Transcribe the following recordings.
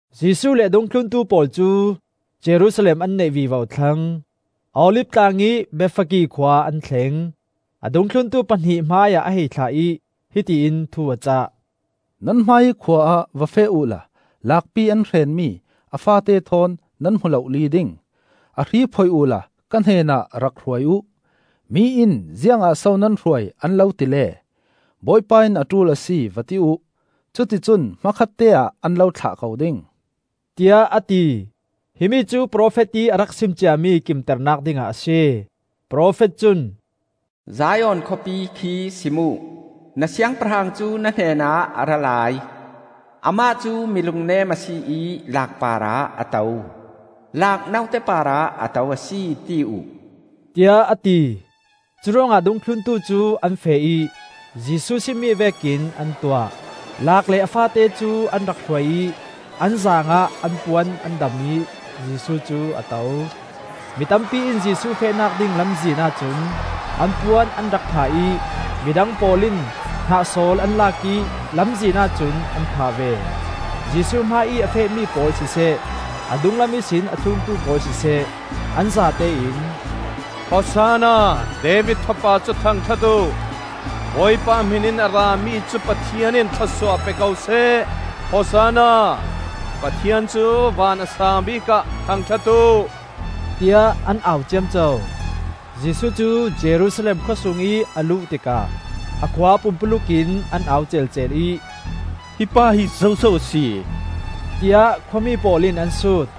Jesuh le a dungthluntu pawl cu Jerusalem an naih vivo thlang. Olif tlang ih Bethphage khua an thleng. A dungthluntu pahnih hmaiah a hei thlah ih, hiti in thu a cah. “Nan hmaiih khua ah va feh uhla laakpi an hrenmi a faate thawn nan hmu lohli ding. A hri phoih uhla ka hnenah rak hruai uh. ‘Mi in ziangah so nan hruai,’ an lo tile, ‘Bawipa in a ṭul a si,’ va ti uh. Cuticun hmakhatte ah an lo thlah ko ding,” tiah a ti. Himi cu profet ih a rak sim ciami kimternak dingah a si. Profet cun: “Zion khawpi khi sim uh, Na siangpahrang cu na hnenah a ra lai; Amah cu mi lungnem a si ih laak parah a to. Laak note parah a to a si, ti uh,” tiah a ti. Curuangah dungthluntu cu an feh ih Jesuh simmi vekin an tuah. Laak le a faate cu an rak hruai ih an zaang ah an puan an dam ih Jesuh cu a to. Mi tampi in Jesuh fehnak ding lamzin ahcun an puan an rak phah ih mi dang pawl in hnahsawl an lak ih lamzin ahcun an phah ve. Jesuh hmaiih a fehmi pawl siseh, a dunglam ihsin a thluntu pawl siseh, an zate in: “Hosanna! David Fapa cu thangṭhat uh! Bawipa ih hmin in a rami cu Pathian in thlawsuah pe ko seh! Hosanna! Pathian cu van a saangbik ah thangṭhat uh!” tiah an au ciamco. Jesuh cu Jerusalem khawsungih a luh tikah a khua pumpuluk in an au celcel ih, “Hi pa hi zoso a si?” tiah khua mi pawl in an sut.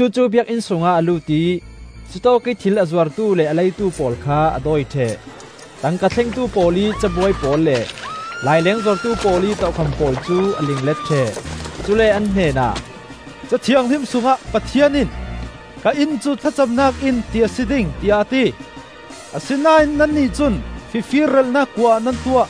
Jesuh cu Biakinn sungah a lut ih cutawkih thil a zuartu le a leitu pawl kha a dawi ṭheh. Tangka thlengtu pawl ih cabuai pawl le laileng zuartu pawl ih tokham pawl cu a linglet ṭheh. Cule an hnenah, “Ca Thianghlim sungah Pathian in, ‘Ka Inn cu thlacamnak inn ti a si ding,’ tiah a ti. Asinain nannih cun fifir relhnak kua ah nan tuah,”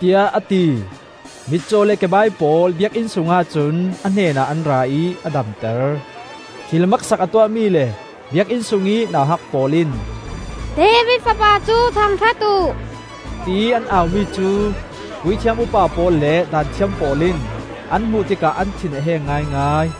tiah a ti. Mitcaw le kebai pawl Biakinn sungah cun a hnenah an ra ih a damter. Thil maksak a tuahmi le Biakinn sungih nauhak pawl in, “David Fapa cu thangṭhat uh,” tiih an aumi cu puithiam upa pawl le Daanthiam pawl in an hmuh tikah an thin a heng ngaingai.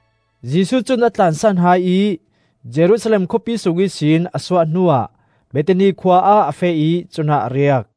Jesuh cun a tlansan hai ih Jerusalem khawpi sung ihsin a suah hnuah Bethani khua ah a feh ih cunah a riak.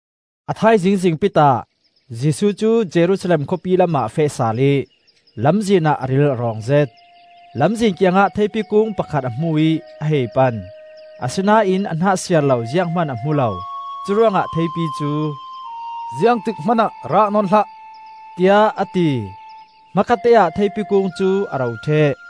A thaizing zingpitah Jesuh cu Jerusalem khawpi lamah a feh sal ih lamzin ah a ril a rawngzet. Lamzin kiangah theipi kung pakhat a hmu ih a hei pan; asinain a hnah siar lo ziang hman a hmu lo. Curuangah theipi cu, “Ziangtik hmanah rah nawn hlah,” tiah a ti. Hmakhatteah theipi kung cu a ro ṭheh.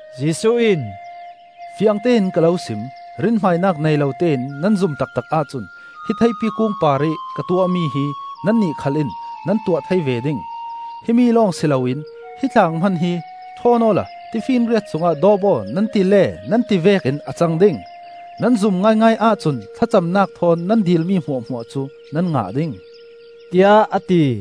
Jesuh in, “Fiangtein ka lo sim: rinhmainak nei lo tein nan zum taktak ahcun hi theipi kung parih ka tuahmi hi nannih khal in nan tuah thei ve ding. Himi lawng si loin hi tlang hman hi ‘ṭhawn awla tifinriat sungah dawp aw,’ nan ti le nan ti vekin a cang ding. Nan zum ngaingai ahcun thlacamnak thawn nan dilmi hmuahhmuah cu nan ngah ding,” tiah a ti.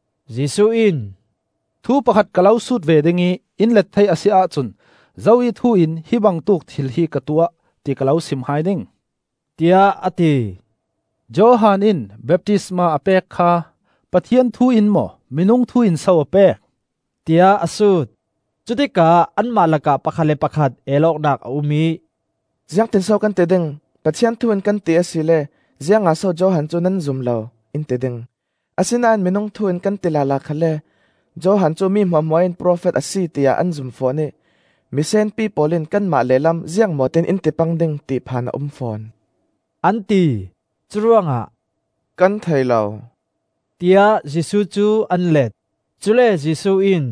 Jesuh in, “Thu pakhat ka lo sut ve ding ih in let thei a si ahcun zo ih thu in hi bangtuk thil hi ka tuah ti ka lo sim hai ding,” tiah a ti. “Johan in baptistma a pek kha Pathian thu in maw minung thu in so a pek,” tiah a sut. Cutikah anmah lakah pakhat le pakhat el awknak a um ih, “Ziangtin so kan ti ding? Pathian thu in kan ti asile, ‘Ziangah so Johan cu nan zum lo,’ in ti ding. Asinain minung thu in kan ti lala khalle Johan cu mi hmuahhmuah in profet a si tiah an zum fawn ih misenpi pawl in kanmah lehlam ziangmaw tiin in ti pang ding, ti phan a um fawn!” an ti. Curuangah, “Kan thei lo,” tiah Jesuh cu an let. Cule Jesuh in,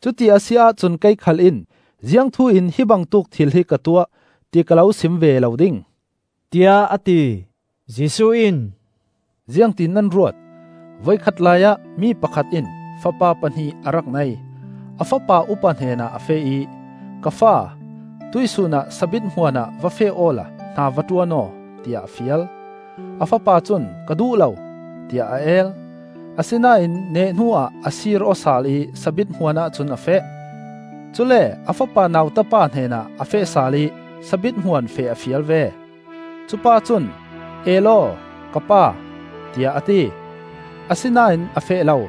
“Cuti a si ahcun kei khal in ziangthu in hi bangtuk thil hi ka tuah, ti ka lo sim ve lo ding,” tiah a ti. Jesuh in, “Ziangtin nan ruat? Voikhat laiah mi pakhat in fapa pahnih a rak nei. A fapa upa hnenah a feh ih, ‘Ka fa, tuihsun ah sabit hmuan ah va feh awla hna va ṭuan aw,’ tiah a fial. A fapa cun, ‘Ka duh lo,’ tiah a el; asinain nehhnu ah a sir-aw sal ih sabit hmuanah cun a feh. Cule a fapa nauta pa hnenah a feh sal ih sabit hmuan feh a fial ve. Cupa cun, ‘E law, ka pa,’ tiah a ti; asinain a feh lo.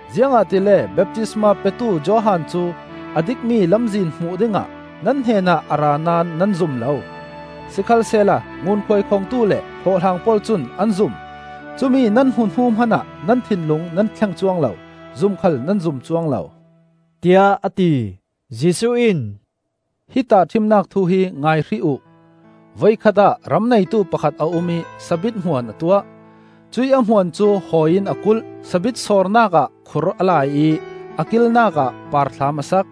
Ziangahtile baptistma petu Johan cu a dikmi lamzin hmuh dingah nan hnenah a ra naón nan zum lo; sikhalsehla ngunkhuai khongtu le hlawhhlang pawl cun an zum. Cumi nan hmuh hnu hmanah nan thinlung nan thleng cuang lo, zum khal nan zum cuang lo,” tiah a ti. Jesuh in, “Hi tahṭhimnak thu hi ngai hrih uh. Voikhat ah ram neitu pakhat a um ih sabit hmuan a tuah. Cuih a hmuan cu hawi in a kulh, sabit sawrnak ah khur a laih ih a kilnakah parthlam a sak.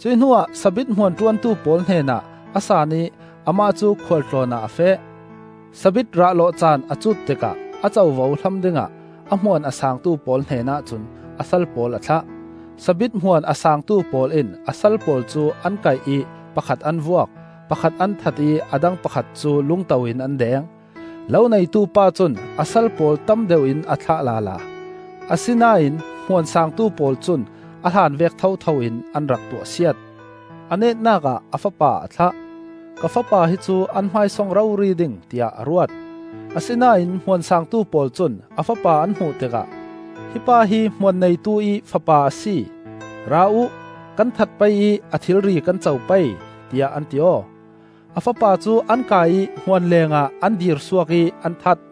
Cuih hnuah sabit hmuan ṭuantu pawl hnenah a saan ih amah cu khual tlawn ah a feh. Sabit rah lawh caan a cut tikah a covo hlam dingah a hmuan a saangtu pawl hnenah cun a sal pawl a thlah. Sabit hmuan a saangtu pawl in a sal pawl cu an kaih ih pakhat an vuak, pakhat an that ih a dang pakhat cu lungto in an deng. Lo neitu pa cun a sal pawl tam deuh in a thlah lala; asinain hmuan saangtu pawl cun a hlan vek thotho in an rak tuahsiat. A netnak ah a fapa a thlah, “Ka fapa hi cu an hmaisong rori ding,” tiah a ruat. Asinain hmuan saangtu pawl cun a fapa an hmuh tikah, “Hi pa hi hmuan neitu ih fapa a si. Ra uh, kan that pei ih a thilri kan co pei,” tiah an ti aw. A fapa cu an kai ih hmuan lengah an dirsuak ih an that.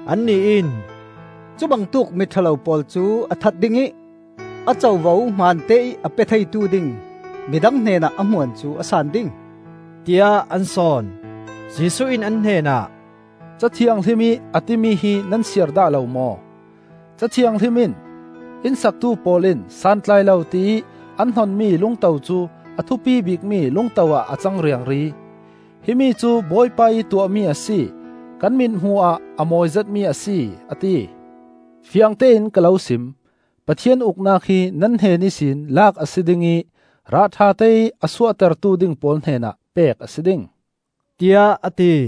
Annih in, “Cubangtuk mi ṭha lo pawl cu a that ding ih a covo hman teih a pe theitu ding midang hnenah a hmuan cu a san ding,” tiah an sawn. Jesuh in an hnenah, “Ca Thianghlim ih a timi hi nan siar dah lo maw? Ca Thianghlim in: ‘Inn saktu pawl in santlai lo tiih an hnonmi lungto cu A thupi bikmi lungto ah a cang riangri; Himi cu Bawipa ih tuahmi a si, kan mithmuh ah a mawi zetmi a si,’ a ti. “Fiangtein ka lo sim: Pathian Uknak hi nan hnen ihsin lak a si ding ih rah ṭhateih a suahtertu ding pawl hnenah pek a si ding,” tiah a ti.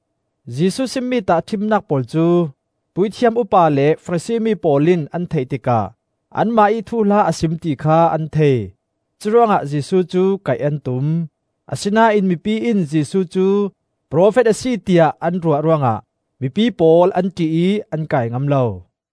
Jesuh simmi tahṭhimnak pawl cu puithiam upa le Farasi mi pawl in an theih tikah anmah ih thuhla a sim ti kha an thei. Curuangah Jesuh cu kaih an tum. Asinain mipi in Jesuh cu profet a si tiah an ruah ruangah mipi pawl an ṭih ih an kai ngam lo.